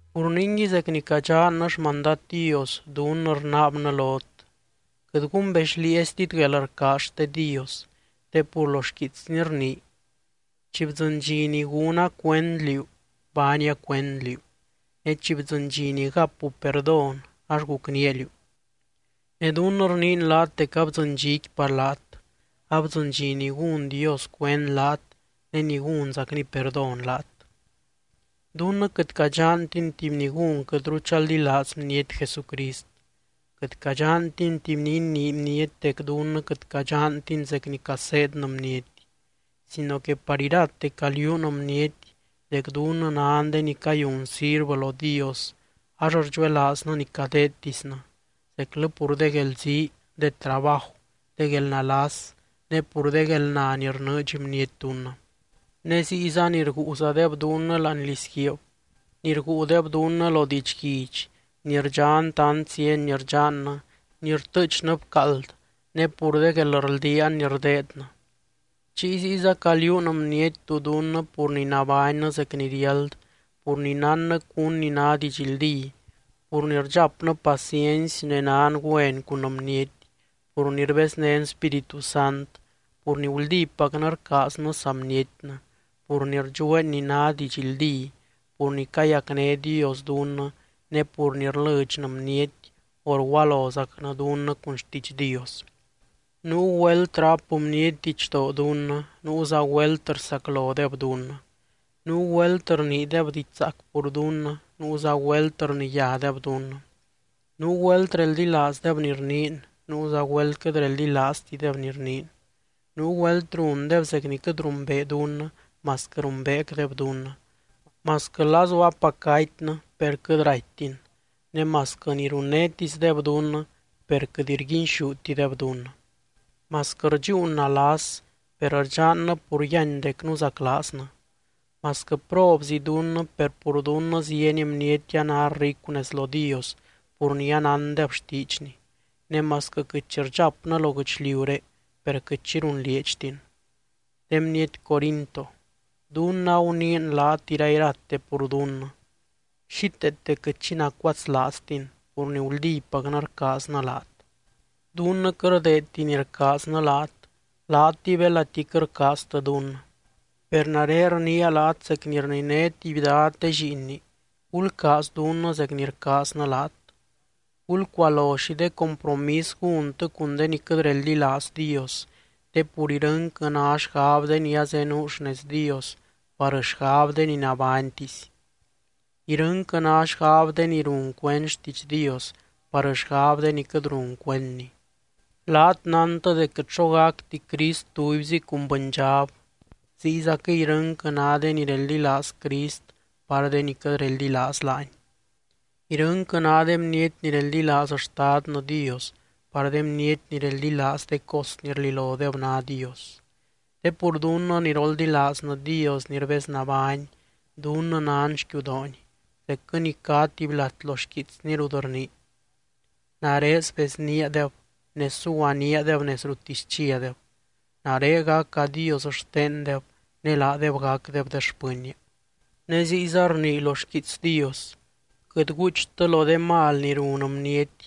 Pur ningui zec ni cadxannɨ xmandad Dios, dunnɨ rnaabnɨ lot: Quɨt gumbexlieeztit guelrcaaz xte Dios. Te pur lo xquiitsny rnii: Chi bdzɨny dxi ni gúna cuend liú, baania cuend liú ne chi bdzɨny dxi ni gapu perdón ax gucnía liú. Ne dunnɨ rniin laat dec abdzɨny dxiqui par laat, abdzɨny dxi ni gún Dios cuend laat ne ni gúnzacny perdón laat. Dunnɨ quɨt cadxantin tuby ni gún quɨtru chaldilaaz bniety Jesucrist, quɨt cadxantin tuby ni inii bniety dec dunnɨ quɨt cadxantin zec ni caseednɨ bniety. Sino que par irate caliuun bniety dec dunnɨ nan de ni cayun sirvɨ lo Dios ax rdxuelaaznɨ ni cadeedtisnɨ, zeclɨ pur de guelzii, de trabaju, de guelnalas, ne pur de guelna ni rnɨɨdx bniety dunnɨ. Ne ziyza ni rguuzadeb dunnɨ láani lizguiib, ni rguudeb dunnɨ lo didxguidx, ni rdxan tant zieny ni rdxannɨ, ni rtɨɨchnɨ bcaald ne pur de guelrldiaan ni rdeednɨ. Chiy ziyza caliuun bniety tú dunnɨ pur ni nabánnɨ zec ni riáld, pur ni nánnɨ cún ni ná didxldí, pur ni rdxapnɨ paciency ne nan güen cun bniety, pur ni rbeznén Spíritu Sant, pur ni guldípacnɨ rcaaznɨ saa bnietnɨ, pur ni rdxueen ni ná didxldí, pur ni cayacné Dios dunnɨ, ne pur ni rlɨdxnɨ bniety o rgualozacnɨ dunnɨ cun xtiidx Dios. Nuu güelt ráp bniety didxdoo dunnɨ, nuuza güelt rsaclodeb dunnɨ. Nuu güelt rniideb diidx zaac pur dunnɨ, nuuza güelt rniyádeb dunnɨ. Nuu güelt reldilaazdeb ni rniin, nuuza güelt quɨt reldilaaztideb ni rniin. Nuu güelt rundeb zec ni quɨt rumbee dunnɨ, masquɨ rumbeecdeb dunnɨ. Masquɨ lazu apac gatynɨ per quɨt raittin, ne masquɨ ni runnétisdeb dunnɨ per quɨt rguinxútideb dunnɨ. Masquɨ rdxúun nalas, per rdxannɨ pur yíany dec nuzaclaaznɨ. Masquɨ probzi dunnɨ per pur dunnɨ zieny bniety a ná ricu nez lo Dios pur ni anándeb xtiidxny. Ne masquɨ quɨt xi rdxapnɨ lo guɨchliuré, per quɨt xi runlieedxtin. De bniety Corinto, dunnɨ aguniin laat irairate pur dunnɨ, xíteete quɨt xi nacuatslaaztin pur ni guldípacnɨ rcaaznɨ laat. Dunnɨ quɨt rdeedti ni rcaaznɨ laat, laatɨy belati quɨt rcaaztɨ dunnɨ. Per nare rniia laat zec ni rniné tuby dad de lliinni: Gulcaaz dunnɨ zec ni rcaaznɨ laat. Gulcualo xi de compromis gúntɨ cun de ni quɨt reldilaaz Dios, te pur irɨnquɨ ná xgab de ni azenuu xnez Dios par xgab de ni nabánytisy. Irɨnquɨ ná xgab de ni run cuend xtiidx Dios par xgab de ni quɨt run cuendny. Laat nántɨ dec quɨt xo gacti Crist tubyzi cun bɨndxab, ziyzaquɨy irɨnquɨ ná de ni reldilaaz Crist par de ni quɨt reldilaaz laany. Irɨnquɨ ná de bniety ni reldilaaz Xtadnɨ Dios par de bniety ni reldilaaz de cos ni rlilodeb ná dios. Te pur dunnɨ ni roldilaaznɨ Dios ni rbeznabány, dunnɨ nan xquiudoony, zecquɨ ni cá tuby lat lo xquiitsny rut rnii: Nare sbezníadeb ne suguaníadeb nez ruttisy chiadeb. Nare gaca Dios xtendeb ne laadeb gacdeb de xpɨnnia. Ne ziyza rnii lo xquiits Dios: Quɨt guuchtɨ lo de mal ni run bniety,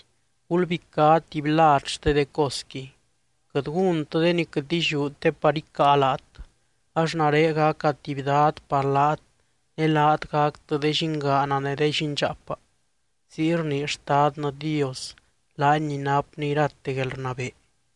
gulbicá tuby lad xte de cosqui. Quɨt gúntɨ de ni quɨt illiú te par icáa laat, ax nare gaca tuby dad par laat ne laat gactɨ de llingaana ne de llindxaapa. Ziy rnii Xtadnɨ Dios, laany ni napny irate guelrnabee.